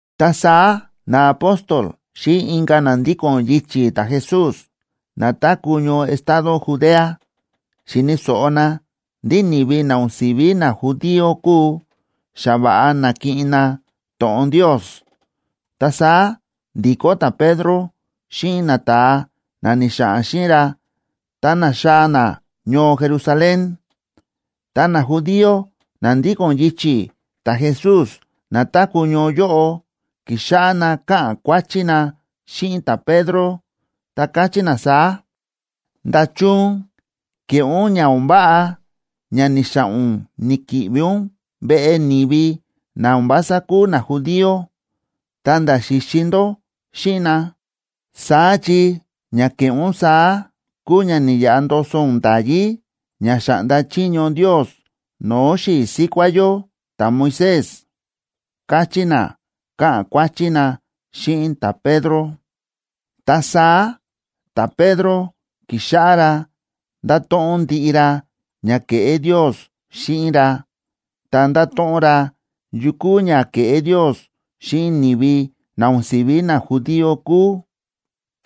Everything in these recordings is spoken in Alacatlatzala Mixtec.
Ta saá naapóstol xíꞌin inka̱ na ndíko̱n yichi̱ ta̱Jesús na táku̱ ñoo estado Judea xi̱ni̱ so̱ꞌo na ndí ni̱vi na o̱n si̱ví najudío kúu, xa va̱ꞌa na̱kiꞌin na to̱ꞌon Ndios. Ta saá ndi̱kó ta̱Pedro xíꞌin nata̱a na ni̱xa̱ꞌa̱n xíꞌin ra, ta na̱xaa̱ na ñoo Jerusalén. Ta najudío na ndíko̱n yichi̱ ta̱Jesús na táku̱ ñoo yóꞌo, ki̱xáꞌá na káꞌa̱n kuáchí na xíꞌin ta̱Pedro, ta káchí na saá: ―¿Nda̱chun ke̱ꞌé ún ña o̱n váꞌa ña ni̱xa̱ꞌa̱n ún ni̱ki̱ꞌvi ún veꞌe ni̱vi na o̱n vása kúu najudío, ta̱nda̱ xi̱xi ndó xíꞌin na? Saá chi ña ke̱ꞌé ún saá kúu ña ni̱yaꞌa ndoso ún nda̱yí ña xa̱ꞌnda chiño Ndios no̱o̱ xi̱i̱ síkuá yó ta̱Moisés ―káchí na, káꞌa̱n kuáchí na xíꞌin ta̱Pedro. Ta saá ta̱Pedro ki̱xáꞌá ra ndáto̱ꞌon ndiꞌi ra ña ke̱ꞌé Ndios xíꞌin ra, ta nda̱to̱ꞌon ra yu kúu ña ke̱ꞌé Ndios xíꞌin ni̱vi na o̱n si̱ví najudío kúu,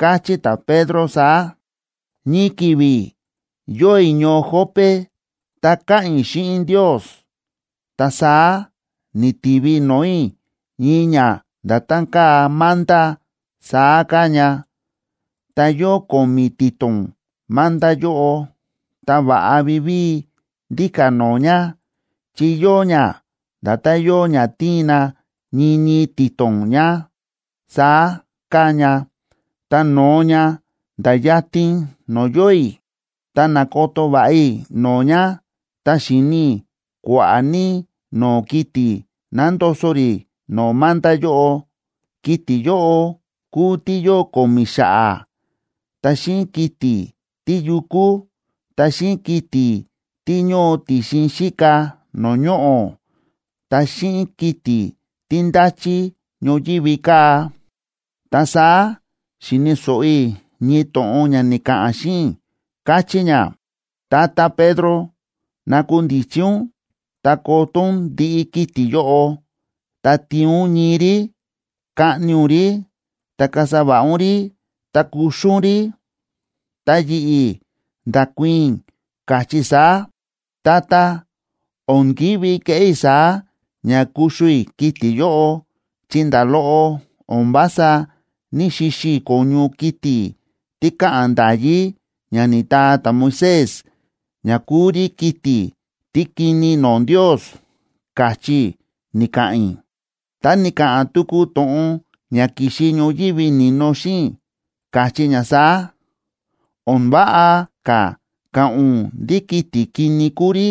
káchí ta̱Pedro saá: ―Ñii ki̱vi̱ yóo i̱ ñoo Jope ta káꞌa̱n i̱ xíꞌin Ndios, ta saá ni̱tivi no̱o̱ i̱ ñii ña nda̱tán káa manta saá káa ña, ta yóo ko̱mi̱ ti̱to̱n manta yóꞌo, ta va̱ꞌa vivíi ndíka̱ no̱o̱ ña, chi yóo ña nda̱tán yóo ña tíin na ñii ñii ti̱to̱n ña, saá káa ña, ta no̱o ña, nda̱ yatin no̱o̱ yóo i̱. Ta na̱koto va̱ꞌa i̱ no̱o̱ ña, ta xi̱ni i̱ kua̱ꞌa̱ ní no̱o̱ kiti̱ nándoso rí no̱o̱ manta yóꞌo. Kiti̱ yóꞌo kúu tí yóo ko̱mi̱ xa̱ꞌa̱, ta xíꞌin kiti̱ tíyukú, ta xíꞌin kiti̱ tí ñóo ti̱xin xíka no̱o̱ ñoꞌo̱, ta xíꞌin kiti̱ tí ndáchí ñoyívi kaa̱. Ta saá xi̱ni̱ so̱ꞌo i̱ ñii to̱ꞌon ña ni̱ka̱ꞌa̱n xíꞌin i̱, káchí ña: “Tata Pedro, nakundichi ún ta koto ún ndiꞌi kiti̱ yóꞌo, ta tiin ún ñii rí, kaꞌni ún rí, ta kasa va̱ꞌa ún rí, ta kuxu ún rí.” Ta yi̱ꞌi̱ nda̱kuii̱n i̱, káchí i̱ saá: “Tata, o̱n ki̱ví keꞌé i̱ saá ña kuxu i̱ kiti̱ yóꞌo, chi nda̱ loꞌo o̱n vása ní‑xixi i̱ ko̱ñu kiti̱ tí káꞌa̱n nda̱yí ña ni̱taa ta̱Moisés ña kúu rí kiti̱ tí kini no̱o̱ Ndios”, káchí i̱ ni̱ka̱ꞌa̱n i̱. Ta ni̱ka̱ꞌa̱n tuku to̱ꞌon ña ki̱xi ñoyívi ni̱no xíꞌin i̱, káchí ña saá: “O̱n váꞌa ka̱ ka̱ꞌa̱n ún ndí kiti̱ kini kúu rí,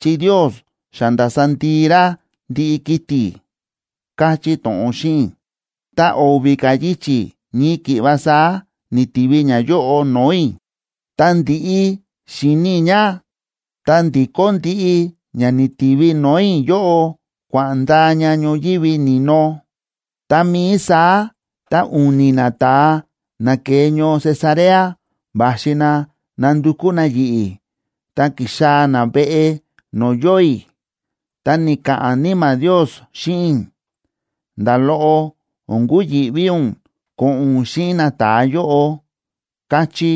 chi Ndios xa nda̱sa ndii ra ndiꞌi kiti̱”, káchí to̱ꞌon xíꞌin i̱. Ta o̱vi̱ ka̱ yichi̱ ñii ki̱ꞌva saá ni̱tivi ñayóꞌo no̱o̱ i̱. Ta ndi̱ꞌi xi̱ni i̱ ña, ta ndi̱kó ndiꞌi ña ni̱tivi no̱o̱ i̱ yóꞌo kua̱ꞌa̱n ndaa ña ñoyívi ni̱no. Tá mií saá ta u̱ni̱ nata̱a na ke̱e ñoo Cesarea va̱xi na nándukú na yi̱ꞌi̱, ta ki̱xaa̱ na veꞌe no̱o̱ yóo i̱. Ta ni̱ka̱ꞌa̱n Níma̱ Ndios xíꞌin i̱: “Nda̱ loꞌo o̱n kuyi̱ꞌví ún ko̱ꞌo̱n ún xíꞌin nata̱a yóꞌo”, káchí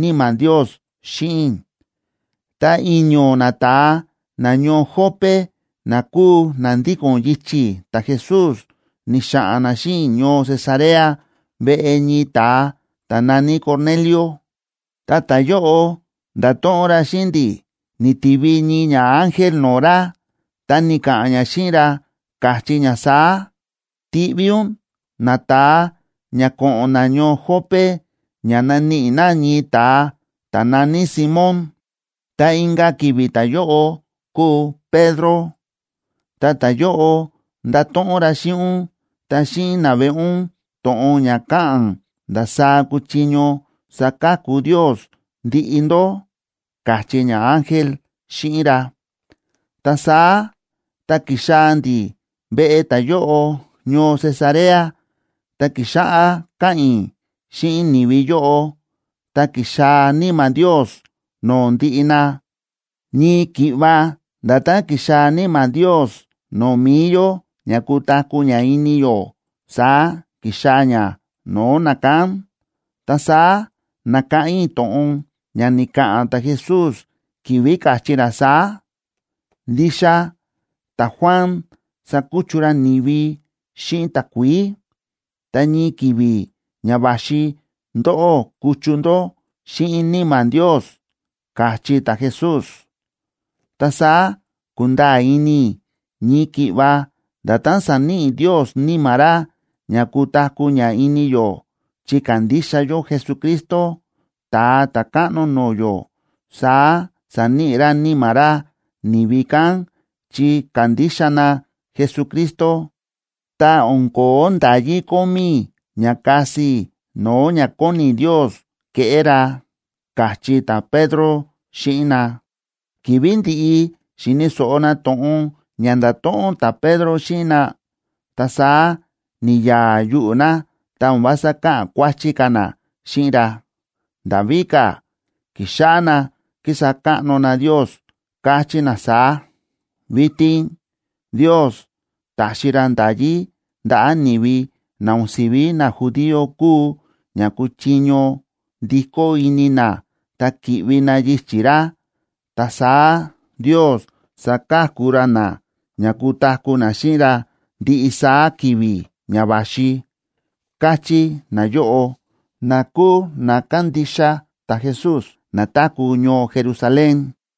Níma̱ Ndios xíꞌin i̱. Ta i̱ño̱ nata̱a nañoo Jope na kúu na ndíko̱n yichi̱ ta̱Jesús, ni̱xa̱ꞌa̱n na xíꞌin i̱ ñoo Cesarea veꞌe ñii ta̱a ta̱ na̱ní Cornelio. Ta ta̱yóꞌo nda̱to̱ꞌon ra xíꞌin ndi̱ ni̱tivi ñii ñaángel no̱o̱ ra, ta ni̱ka̱ꞌa̱n ña xíꞌin ra, káchí ña saá: “Tiꞌví ún nata̱a ña ko̱ꞌo̱n na ñoo Jope ña naníꞌi na ñii ta̱a ta̱ na̱ní Simón, ta inka̱ ki̱vi̱ ta̱yóꞌo kúu Pedro. Ta ta̱yóꞌo ndato̱ꞌon ra xíꞌin ún ta xíꞌin naveꞌe ún to̱ꞌon ña káꞌa̱n ndasaá kuchiño saka̱ku Ndios ndiꞌi ndó”, káchí ñaángel xíꞌin ra. Ta saá tá ki̱xaa̱ ndi̱ veꞌe ta̱yóꞌo ñoo Cesarea, ta ki̱xáꞌá káꞌa̱n i̱ xíꞌin ni̱vi yóꞌo, ta ki̱xaa̱ Níma̱ Ndios no̱o̱ ndiꞌi na. Ñii ki̱ꞌva nda̱tán ki̱xaa̱ Níma̱ Ndios no̱o̱ mi̱i yó ña kutaku̱ ña ini yó, saá ki̱xaa̱ ña no̱o̱ nakán. Ta saá na̱káꞌán i̱ to̱ꞌon ña ni̱ka̱ꞌa̱n ta̱Jesús ki̱vi̱ káchí ra saá: “Ndixa ta̱Juan sa̱kuchu ra ni̱vi xíꞌin takuií, ta ñii ki̱vi̱ ña va̱xi ndóꞌó kuchu ndó xíꞌin Níma̱ Ndios”, káchí ta̱Jesús. Ta saá ku̱nda̱a̱ ini i̱ ñii ki̱ꞌva nda̱tán sa̱níꞌi Ndios Níma̱ ra ña kutaku̱ ña ini yó chi ka̱ndixa yó Jesucristo, Ta̱a Ta̱káꞌno no̱o̱ yó, saá sa̱níꞌi ra Níma̱ ra ni̱vi kán chi ka̱ndixa na Jesucristo. Ta o̱n ko̱ó nda̱yí kómí i̱ ña kasi i̱ no̱o̱ ña kóni Ndios keꞌé ra ―káchí ta̱Pedro xíꞌin na. Ki̱vi̱ ndi̱ꞌi xi̱ni̱ so̱ꞌo na to̱ꞌon ña nda̱to̱ꞌon ta̱Pedro xíꞌin na, ta saá ni̱ya̱a̱ yuꞌu̱ na, ta o̱n vása káꞌa̱n kuáchí ka̱ na xíꞌin ra. Nda̱ víka̱, ki̱xáꞌá na kísa káꞌno na Ndios, káchí na saá: ―Vitin Ndios ta̱xi ra nda̱yí ndaꞌa̱ ni̱vi na o̱n si̱ví najudío kúu ña kuchiño ndikó ini na ta ki̱ꞌvi na yichi̱ ra. Ta saá Ndios saka̱ku ra na ña kutaku̱ na xíꞌin ra ndiꞌi saá ki̱vi̱ ña va̱xi ―káchí nayóꞌo, na kúu na kándixa ta̱Jesús, na táku̱ ñoo Jerusalén.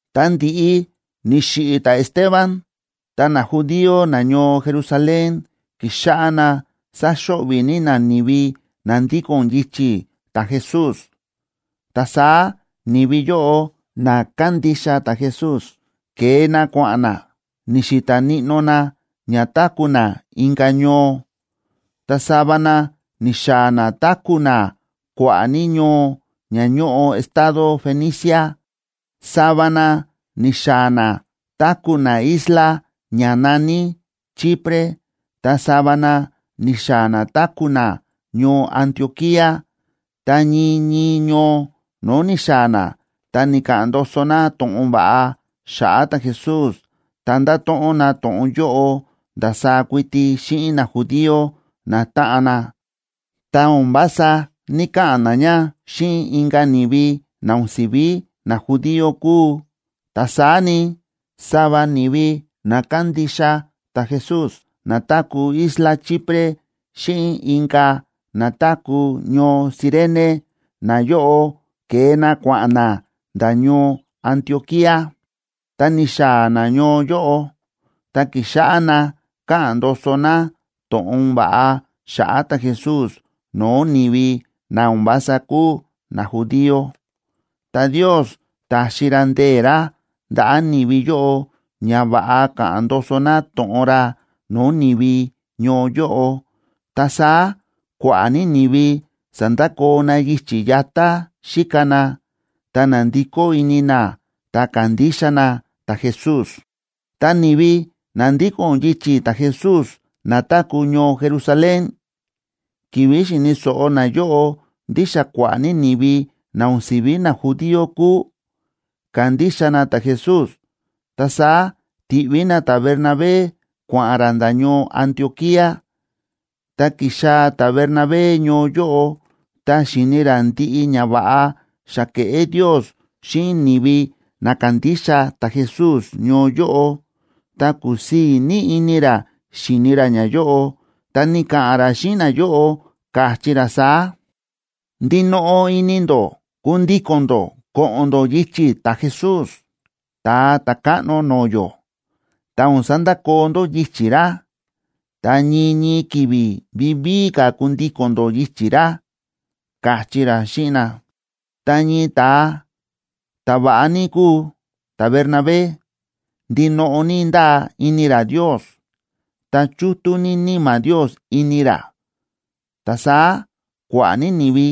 Ta ndi̱ꞌi ni̱xiꞌi̱ ta̱Esteban, ta najudío nañoo Jerusalén ki̱xáꞌá na sáxo̱ꞌvi̱ ní na ni̱vi na ndíko̱n yichi̱ ta̱Jesús. Ta saá ni̱vi yóꞌo na kándixa ta̱Jesús, ke̱e na kua̱ꞌa̱n na, ni̱xi̱ta̱ níꞌnó na ña táku̱ na inka̱ ñoo. Ta sava na ni̱xaa̱ na táku̱ na kua̱ꞌa̱ ní ñoo ña ñóꞌo estado Fenicia, sava na ni̱xaa̱ na táku̱ na isla ña na̱ní Chipre, ta sava na ni̱xaa̱ na táku̱ na ñoo Antioquía. Ta ñii ñii ñoo no̱o̱ ni̱xaa̱ na, ta ni̱ka̱ꞌa̱n ndoso na to̱ꞌon va̱ꞌa xa̱ꞌa̱ ta̱Jesús, ta nda̱to̱ꞌon na to̱ꞌon yóꞌo ndasaá kuiti xíꞌin najudío natáꞌan na, ta o̱n vása ní‑kaꞌa̱n na ña xíꞌin inka̱ ni̱vi na o̱n si̱ví najudío kúu. Ta saá ni, sava ni̱vi na kándixa ta̱Jesús na táku̱ isla Chipre xíꞌin inka̱ na táku̱ ñoo Cirene, nayóꞌo ke̱e na kua̱ꞌa̱n na nda̱ ñoo Antioquía. Tá ni̱xaa̱ na ñoo yóꞌo, ta ki̱xáꞌá na káꞌa̱n ndoso na to̱ꞌon va̱ꞌa xa̱ꞌa̱ ta̱Jesús no̱o̱ ni̱vi na o̱n vása kúu najudío. Ta Ndios ta̱xi ra ndee̱ ra ndaꞌa̱ ni̱vi yóꞌo ña va̱ꞌa ka̱ꞌa̱n ndoso na to̱ꞌon ra no̱o̱ ni̱vi ñoo yóꞌo, ta saá kua̱ꞌa̱ ní ni̱vi sa̱ndakoo na yichi̱ yatá xíka na, ta na̱ndikó ini na ta ka̱ndixa na ta̱Jesús. Ta ni̱vi na ndíko̱n yichi̱ ta̱Jesús na táku̱ ñoo Jerusalén, ki̱vi̱ xi̱ni̱ so̱ꞌo nayóꞌo ndí xa kua̱ꞌa̱ ní ni̱vi na o̱n si̱ví najudío kúu, ka̱ndixa na ta̱Jesús, ta saá ti̱ꞌví na ta̱Bernabé kua̱ꞌa̱n ra nda̱ ñoo Antioquía. Tá ki̱xaa̱ ta̱Bernabé ñoo yóꞌo, ta xi̱ni ra ndiꞌi ñava̱ꞌa xa ke̱ꞌé Ndios xíꞌin ni̱vi na kándixa ta̱Jesús ñoo yóꞌo, ta kúsii̱ ní ini ra xíni ra ñayóꞌo. Ta ni̱ka̱ꞌa̱n ra xíꞌin nayóꞌo, káchí ra saá: ―Ndinoꞌo ini ndó kundíko̱n ndó ko̱ꞌo̱n ndó yichi̱ ta̱Jesús, Ta̱a Ta̱káꞌno no̱o̱ yó, ta o̱n sandakoo ndó yichi̱ ra, ta ñii ñii ki̱vi̱ vivíi ka̱ kundíko̱n ndó yichi̱ ra ―káchí ra xíꞌin na. Ta ñii ta̱a ta̱va̱ꞌa ní kúu ta̱Bernabé, ndinoꞌo ní ndáa ini ra Ndios, ta chútú ní Níma̱ Ndios ini ra. Ta saá kua̱ꞌa̱ ní ni̱vi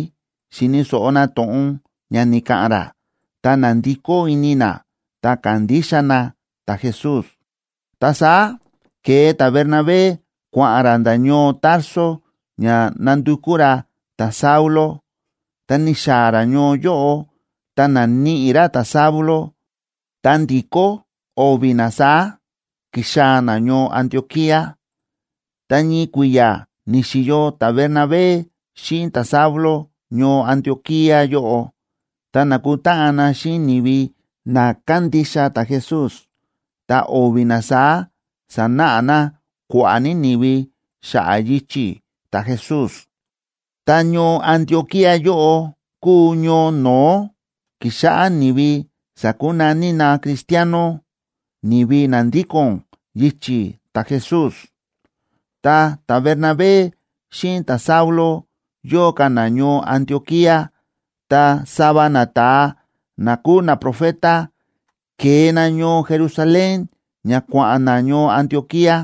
xi̱ni̱ so̱ꞌo na to̱ꞌon ña ni̱ka̱ꞌa̱n ra, ta na̱ndikó ini na, ta ka̱ndixa na ta̱Jesús. Ta saá ke̱e ta̱Bernabé kua̱ꞌa̱n ra nda̱ ñoo Tarso ña nandukú ra ta̱Saulo. Tá ni̱xaa̱ ra ñoo yóꞌo ta na̱níꞌi ra ta̱Saulo, ta ndi̱kó o̱vi̱ na saá, ki̱xaa̱ na ñoo Antioquía. Ta ñii kui̱ya̱ ni̱xi̱yo ta̱Bernabé xíꞌin ta̱Saulo ñoo Antioquía yóꞌo, ta nákutáꞌan na xíꞌin ni̱vi na kándixa ta̱Jesús, ta o̱vi̱ na saá sánáꞌa na kua̱ꞌa̱ ní ni̱vi xa̱ꞌa̱ yichi̱ ta̱Jesús. Ta ñoo Antioquía yóꞌo kúu ñoo no̱ó ki̱xáꞌá ni̱vi sa̱kunaní na cristiano, ni̱vi na ndíko̱n yichi̱ ta̱Jesús. Tá ta̱Bernabé xíꞌin ta̱Saulo yóo ka̱ na ñoo Antioquía, ta sava nata̱a na kúu naprofeta, ke̱e na ñoo Jerusalén ña kua̱ꞌa̱n na ñoo Antioquía.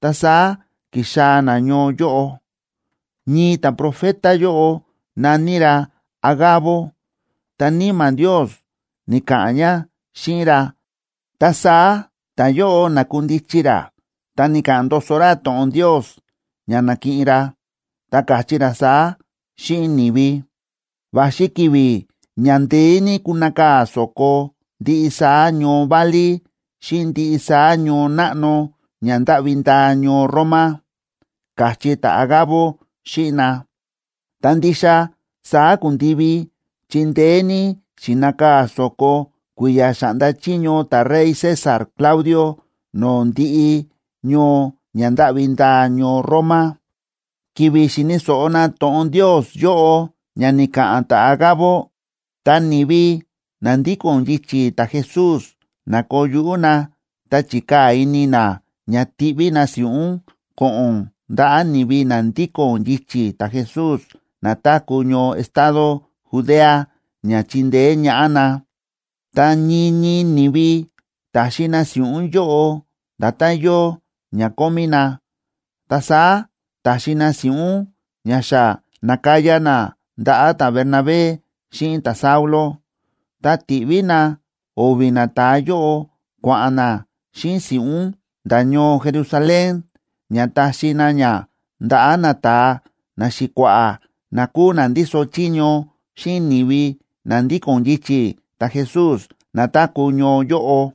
Ta saá ki̱xaa̱ na ñoo yóꞌo. Ñii ta̱profeta yóꞌo na̱ní ra Agabo, ta Níma̱ Ndios ni̱ka̱ꞌa̱n ña xíꞌin ra, ta saá ta̱yóꞌo na̱kundichi ra ta ni̱ka̱ꞌa̱n ndoso ra to̱ꞌon Ndios ña na̱kiꞌin ra, ta káchí ra saá xíꞌin ni̱vi: ―Va̱xi ki̱vi̱ ña ndeé ní kunakaa̱ so̱ko ndiꞌi saá ñoo válí xíꞌin ndiꞌi saá ñoo náꞌno ña ndáꞌvi ndaa ñoo Roma ―káchí ta̱Agabo xíꞌin na. Ta ndixa saá ku̱ndivi, chi ndeé ní xi̱nakaa̱ so̱ko kui̱ya̱ xa̱ꞌnda chiño ta̱rey César Claudio no̱o̱ ndiꞌi ñoo ña ndáꞌvi ndaa ñoo Roma. Ki̱vi̱ xi̱ni̱ so̱ꞌo na to̱ꞌon Ndios yóꞌo ña ni̱ka̱ꞌa̱n ta̱Agabo, ta ni̱vi na ndíko̱n yichi̱ ta̱Jesús na̱koo yuꞌú na ta chi̱kaa̱ ini na ña tiꞌví na si̱ꞌún ko̱ꞌo̱n ndaꞌa̱ ni̱vi na ndíko̱n yichi̱ ta̱Jesús na táku̱ ñoo estado Judea ña chindeé ñaꞌá na. Ta ñii ñii ni̱vi ta̱xi na si̱ꞌún yóꞌo nda̱tán yóo ña kómí na. Ta saá ta̱xi na si̱ꞌún ña xa na̱kaya na ndaꞌa̱ ta̱Bernabé xíꞌin ta̱Saulo, ta ti̱ꞌví na o̱vi̱ nata̱a yóꞌo kua̱ꞌa̱n na xíꞌin si̱ꞌún nda̱ ñoo Jerusalén, ña taxi na ña ndaꞌa̱ nata̱a naxi̱kua̱ꞌa̱ na kúu na ndíso chiño xíꞌin ni̱vi na ndíko̱n yichi̱ ta̱Jesús na táku̱ ñoo yóꞌo.